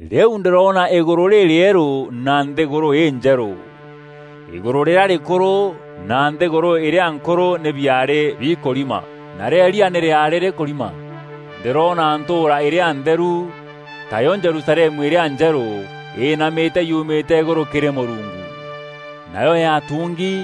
Rîu ndîroona îgûrû rîrîerû na nthîgûrû înjerû. Îgûrû rîrîa rîkûrû na nthîgûrû îrîa nkûrû nî biaarî bikûrima. Narîo îrîa nî rîaarî rîkûrima. Ndîroona ntûûra îrîa ntheru, tayo Jerusalemu îrîa njerû, îînamîte yumîte îgûrû kîrî Mûrungu. Nayo yaatungi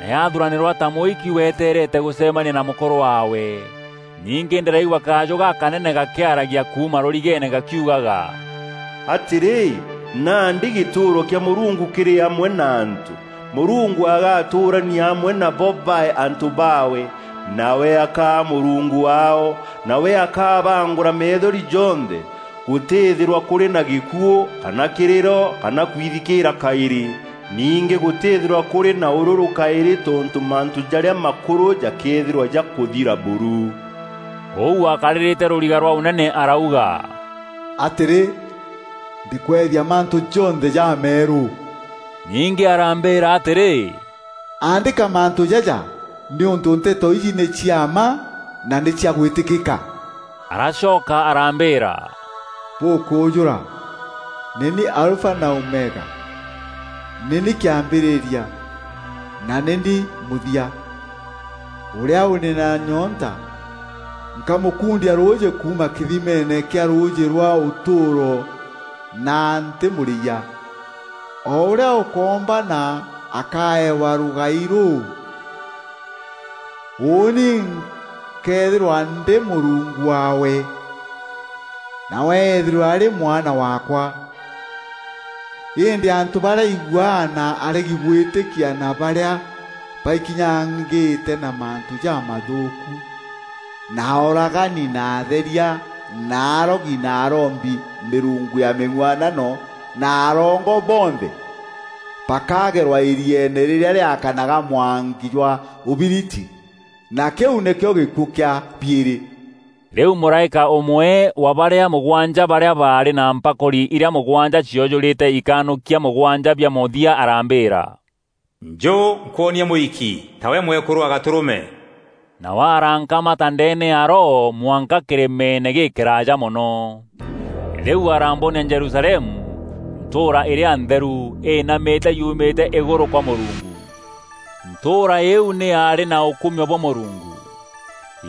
na yathuranîrwa ta mûiki weteerete gûcemania na mûkûrû waawe. Ningî ndîraigua kajû gakanene gakîaragia kuuma rûrigeene gakiugaga, “atîrî, nandî gîtûûro kîa Mûrungu kîrî amwe na antû. Mûrungu agaatûûrania amwe nabo baae antû baawe, nawe akaa Mûrungu waao. Nawe akabaangûra methori jonthe. Gûtîthîrwa kûrî na gîkuû kana kîrîro kana kwithikîîra kaîrî. Ningî gûtîthîrwa kûrî na ûrûrû kaîrî tontû mantû jarîa makûrû jakeethîrwa jakûthira buru.” Ûu wakarîrîte rûriga rwa ûnene arauga, “Atîrî, ndîkweethia mantû jonthe jameerû.” Ningî arambîîra atîrî, “Aandîka mantû jaja, nîûntû nteto iji nî cia mma na nî cia gwîtîkîka.” Aracoka arambîîra, “Bûkûûjûra! Nî ni Alfa na Omega, nî ni kîambîrîria na nî ni mûthia. Ûrîa ûrî na nyoonta nkamûkundia rûûjî kuuma kîthimeene kîa rûûjî rwa ûtûûro na ntîmûrîyia. O ûrîa ûkoombana akaewa rûgai rûu. Ûûni nkeethîrwa ndî Mûrungu waawe, nawe eethîrwe arî mwana waakwa. Îndî antû barîa iguaa na aregi gwîtîkia na barîa baikinyangîte na mantû jamathûûku na ooragani na atheria na arogi na arombi mîrungu ya mîng'uanano na arongo bonthe, bakagerwa îrieene rîrîa rîakanaga mwanki jwa ûbiriti; na kîu nîkîo gîkuû kîa biîrî.” Rîu mûraîka ûmwe wa barîa mûgwanja barîa baarî na mpakûri irîa mûgwanja ciojûrîte ikanûkia mûgwanja bia mûthia arambîîra, “Njû nkwonie mûiki, tawe mwekûrû wa Gatûrûme.” Nawe arankamata ndeene ya Roho mwanka kîrîmeene gîkîraaja mono. Rîu arambonia Jerusalemu, ntûûra îrîa ntheru, îînamîte yumîte îgûrû kwa Mûrungu. Ntûûra îîu nî yaarî na ûkumio bwa Mûrungu.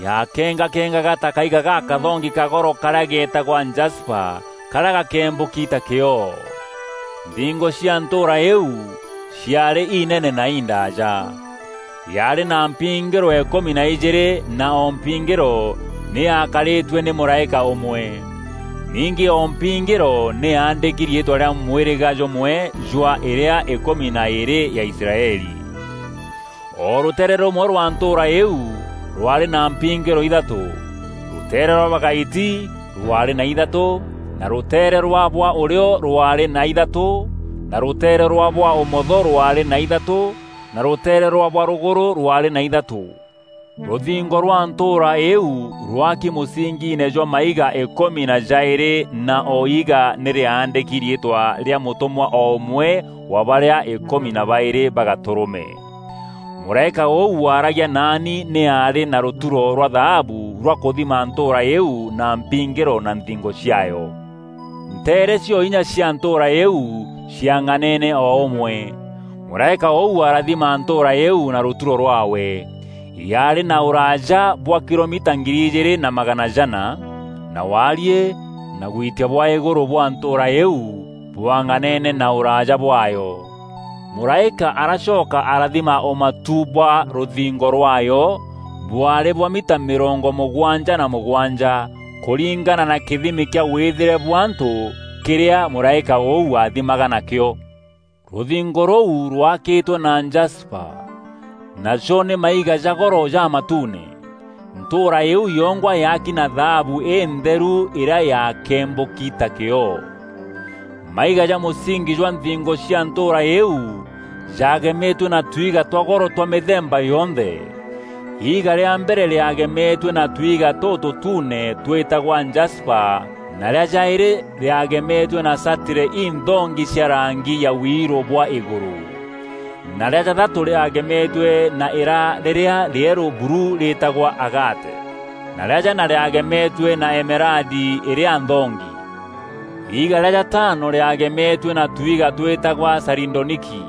Yakengakengaga ta kaiga gakathongi ka goro karîa getagwa jasipa karîa gakembûki ta kîoo. Nthingo cia ntûûra îîu ciaarî inene na indaaja. Yaarî na mpingîro îkûmi na ijîîrî na o mpingîro nî yaakarîtue nî mûraîka ûmwe. Ningî o mpingîro nî yaandîki riîtwa rîa mwîrîga jûmwe jwa îrîa îkûmi na îîrî ya Israeli. O rûteere rûmwe rwa ntûûra îîu rwaarî na mpingîro ithatû: rûteere rwa bwa gaiti rwaarî na ithatû na rûteere rwa bwa ûrîo rwaarî na ithatû na rûteere rwa bwa ûmotho rwaarî na îthatû na rûteere rwa bwa rûgûrû rwaarî na ithatû. Rûthingo rwa ntûûra îîu rwaaki mûsingiine jwa maiga îkûmi na jaîrî na o iiga nî rîaandîki riîtwa rîa mûtûmwa o ûmwe wa barîa îkûmi na baîrî ba Gatûrûme. Mûraîka ûu waaragia naani nî aarî na rûturo rwa thaabu rwa kûthima ntûûra îîu na mpingîro na nthingo ciaayo. Nteere cio inya cia ntûûra îîu ciang'aneene o ûmwe. Mûraîka ûu arathima ntûûra îîu na rûturo rwaawe: yaarî na ûraaja bwa kilomita ngiri ijîîrî na magana jana (2,400km), na waariî na gwitia bwa îgûrû bwa ntûûra îîu bwang'anene na ûraaja bwaayo. Mûraîka aracoka arathima ûmatu bwa rûthingo rwaayo, bwaarî bwa mita mîrongo mûgwanja na mûgwanja (77m) kûringana na kîthimi kîa wîthîre bwa antû kîrîa mûraîka ûu aathimaga nakîo. Rûthingo rûu rwaakîtwe na jasipa, najo nî maiga ja goro jamatuune. Ntûûra îîu yongwa yaaki na thaabu întheru îrîa yaakembûki ta kîoo. Maiga ja mûsingi jwa nthingo cia ntûûra îîu jaagemetue na twiga twa goro twa mîthemba yonthe: iiga rîa mbere rîagemetue na tuiga tûtûtuune twîtagwa jasipa na rîa jaîrî rîagemetue na satire inthongi cia rangi ya wiirû bwa îgûrû, na rîa jathatû rîagemetue na îra rîrîa rîerû buru rîtagwa agate, na rîa jana rîagemetue na emeradi îrîa nthongi. Iiga rîa jataano rîagemetue na tuiga twîtagwa saridoniki,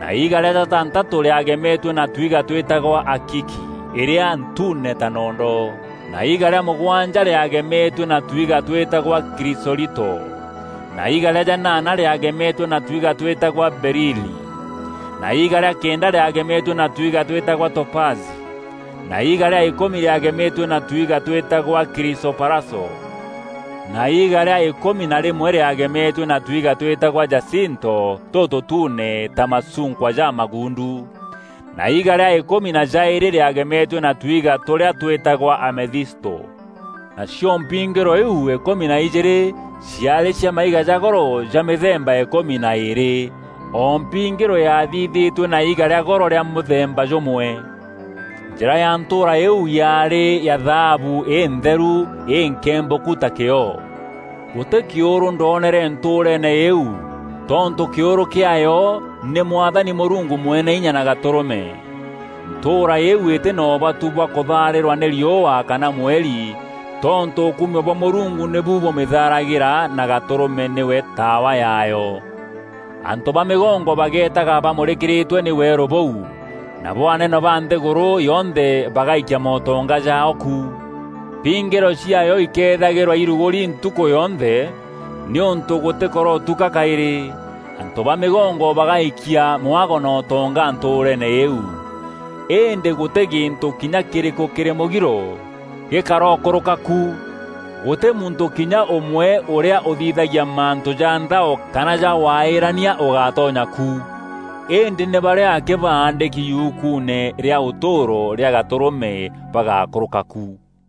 na iiga rîa jatantatû rîagemetue na twiga twîtagwa akiki îrîa ntuune ta nondo, na iiga rîa mûgwanja rîagemetue na twiga twîtagwa kîrisolito na iiga rîa janaana rîagemetue na twiga twîtagwa berili, na iiga rîa kenda rîagemetue na twiga twîtagwa topazi, na iiga rîa îkûmi rîagemetue na twiga twîtagwa kirisoparaso, na iiga rîa îkûmi na rîmwe rîagemetue na twiga twîtagwa jasinto tûtûtuune ja macunkwa jamaguundu, na iiga rîa îkûmi na jaîrî rîagemetue na twiga tûrîa twîtagwa amethisto. Nacio mpingîro iu îkûmi na ijîîrî ciaarî cia maiga ja goro ja mîthemba îkûmi na îîrî, o mpingîro yaathithîtue na iiga rîa goro rîa mûthemba jûmwe. Njîra ya ntûûra îîu yaarî ya thaabu întheru, înkembûku ta kîoo. Gûtî kîûrû ndoonere ntûûreene îîu, tontû kîûrû kîaayo nî Mwathani Mûrungu Mweneinya na Gatûrûme. Ntûûra îîu îtî na ûbatu bwa kûthaarîrwa nî riûa kana mweri tontû ûkumio bwa Mûrungu nîbu bûmîthaaragîra na Gatûrûme nîwe taawa yaayo. Antû ba mîgongo bagetaga bamûrîkîrîtwe nî weerû bûu, nabo anene ba nthîgûrû yonthe bagaikia mootonga jaao ku. Mpingîro ciaayo ikethagîrwa irugûri ntukû yonthe nîûntû gûtîkarotuka kaîrî. Antû ba mîgongo bagaikia mwago na ûtonga ntûûreene îîu. Îndî gûtî gîntû kinya kîrîkû kîrî mûgiro gîkarokûrûka ku. Gûtî muntû kinya ûmwe ûrîa ûthithagia mantû ja nthao kana ja waîrania ûgatonya ku. Îndî nî barîa akî baandîki yukuune rîa ûtûûro rîa Gatûrûme bagakûrûka ku.